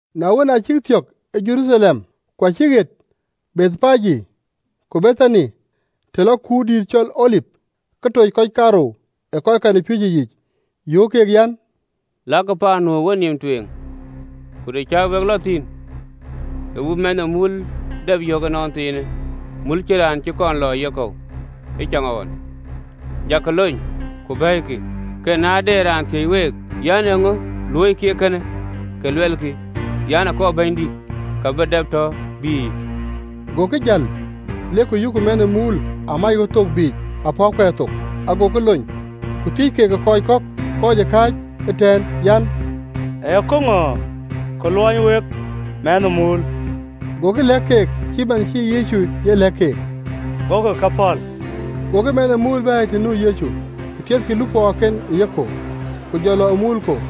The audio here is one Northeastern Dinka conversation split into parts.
Na wën, aa cïk thiɔ̈k ë Jeruthalem, ku acïk ɣet Bethpage ku Bethani, të lɔ kuurdïït cɔl Olip, ke toc kɔc kaarou ë kɔckɛn ë piööcë yiic, Yöök keek an, “Lakï paan nu ë wenïïm tueŋ, ku të cä wek lɔ thïn, ke we bï mɛnh ë muul dap yök ënɔnthiinë, mul cïn raan cï kɔn lɔ ë yekɔ̈u ëcaŋɣɔn, jakï lony, ku bɛ̈ɛ̈ikï. Ku na de raan thiëc week an, Eeŋö luöikï eekënë? Ke luɛlkï an, Akɔɔr Bɛ̈nydït, ka bï dap tɔ bïïyë.” Gokï jäl, lek ku yökkï mɛnh ë muul amac ɣöt thok biic ë apɔ̈kkuɛɛr thok, agokï lony. Ku thiëc keek ë kɔc kɔ̈k ë kɔc kääc ëtɛ̈ɛ̈n an, “Ee käŋö ke luɔny wek mɛnh ë muul?” Gokï lɛ̈k keek cït man cï Yecu ye lɛ̈k keek: gokï ke pɔ̈l. Gokï mɛnh ë muul bɛ̈ɛ̈i të nu Yecu, ku thiethkï lupɔɔken ë yekɔ̈u, ku jɔ lɔ ë muul kɔ̈u.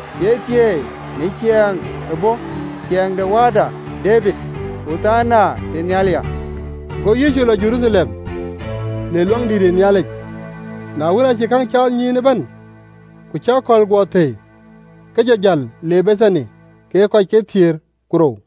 Thieithieei në ciɛɛŋ bɔ̈, ciɛɛŋ de wääda Debid! Ɣothana tënhial ya!” Go Yecu lɔ Jeruthalem, le Luaŋdït, na wën, aacï käŋ caath nyïïn ëbɛ̈n, ku cï akɔ̈l guɔ thëi, ke jɔ jäl le Bethani kekë kɔc kathiëër ku rou.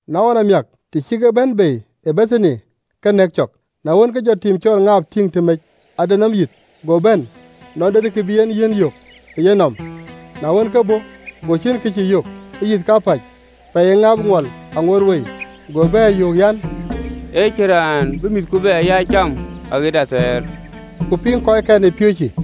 Na ɣɔn amiäk, të cï kek bɛ̈n bei ë Bethani, ke nɛ̈k cɔk. Na wën, ke jɔ tim de ŋaap tïŋ tëmec, ade nɔm yïth go bɛ̈n, nɔn de kë bï yiɛ̈n yök ë yenɔm: na wën, ke bɔ̈, go ciën kë cï yök, ee yïth kapäc, pɛɛi ee ŋaap ŋuɔl aa ŋoot wei. Go bɛ̈ɛ̈r, yöök an, “Ë cïn raan bï mïthku bɛ ya cam aɣet athɛɛr!” Ku aa piŋ kɔckɛn ë piööcë.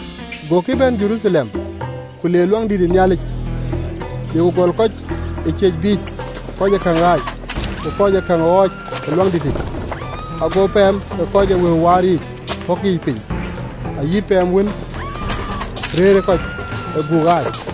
Gokï bɛ̈n Jeruthalem: ku le Luaŋdït, le ku gɔl kɔc ë ciëc biic kɔc ee käŋ ɣaac, ku kɔc ee käŋ ɣɔɔc Luaŋdït, ago pɛɛm ke kɔc ee wëu waar yiic pɔ̈k yiic piny, ayï pɛɛm wën rëërë kɔc ë ajiël ke guuk ɣaac,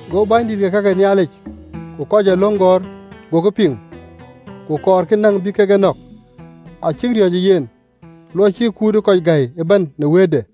Go bɛ̈nydït de ka ke Nhialic ku kɔc ee löŋ gɔ̈ɔ̈r gokï piŋ, ku kɔɔrkï näŋ bï kek e nɔ̈k: acïk riɔ̈ɔ̈c ë yen, luɔi cï kut ë kɔc gäi ëbɛ̈n në wëëtde.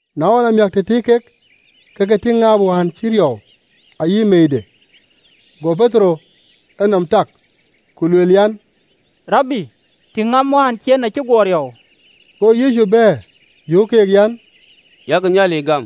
Na ɣɔn amiäk, të tëëk kek, ke ke tïŋ tim de ŋaap wään acï riɔu ayï meeide. Go Petero enɔm tak ku lueel an, “Rabi, tïŋ, ŋaap wään bä cieen, acï guɔ riɔu!” Go Yecu bɛ̈ɛ̈r, yöök keek an, “Yak Nhialic gam.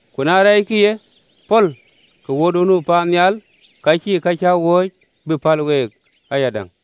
Ku na rɛɛckï ye pɔ̈l, ke Wuöörduön nu paannhial acïï ka cäk wööc bï päl week ayadäŋ.”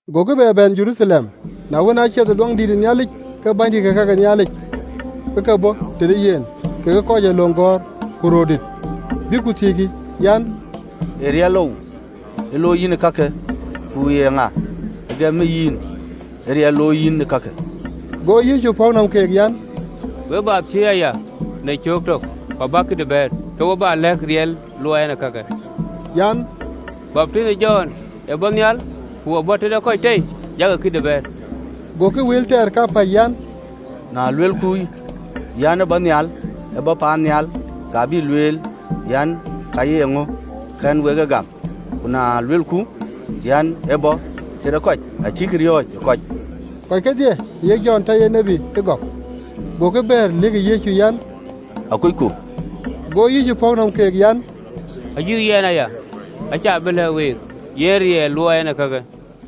Gokï bɛ bɛ̈n Jeruthalem: na wën, aa cath Yecu ë Luaŋdïtic, ke bänydït ke ka ke Nhialic ke ke bɔ̈ tëde yen, kekë kɔc ee löŋ gɔ̈ɔ̈r, ku röördït, bïk ku thiëckï an, “Ee riɛlou looi yïn ee kakë? Ku ye ŋa ë gëm yïn ee riɛlë looi yïn ee kakë?” Go Yecu pɔ̈k nɔm keek an, “We bä thiëëc aya në cöök tök, ku bäk këdï bɛ̈ɛ̈r, ke we bä lɛ̈k riɛl luɔɔi ɛn ee kakë. An, Baptith ë Jɔn, ë bɔ̈ paannhial, ku ë bɔ̈ tëde kɔc tei? Jakï këdï bɛ̈ɛ̈r.” Gokï wël tɛɛr kapäc an, “Na luelku an, ‘Aa bɔ̈ paannhial,’ ka bï lueel an, ‘Ka ye ŋö kɛ̈n wek en gam?’ Ku na luelku an, ‘Aa bɔ̈ tëde kɔc,’ acïk riɔ̈ɔ̈c ë kɔc, kɔc kedhie ayek Jɔn tɔ ye tiët agɔk. Gokï bɛ̈ɛ̈r, lëkkï Yecu an, “Akucku.” Go Yecu pɔ̈k nɔm keek an, “Ayï yɛn aya, acä bï lɛ̈k week yen riɛl luɔɔi ɛn ee kakë.”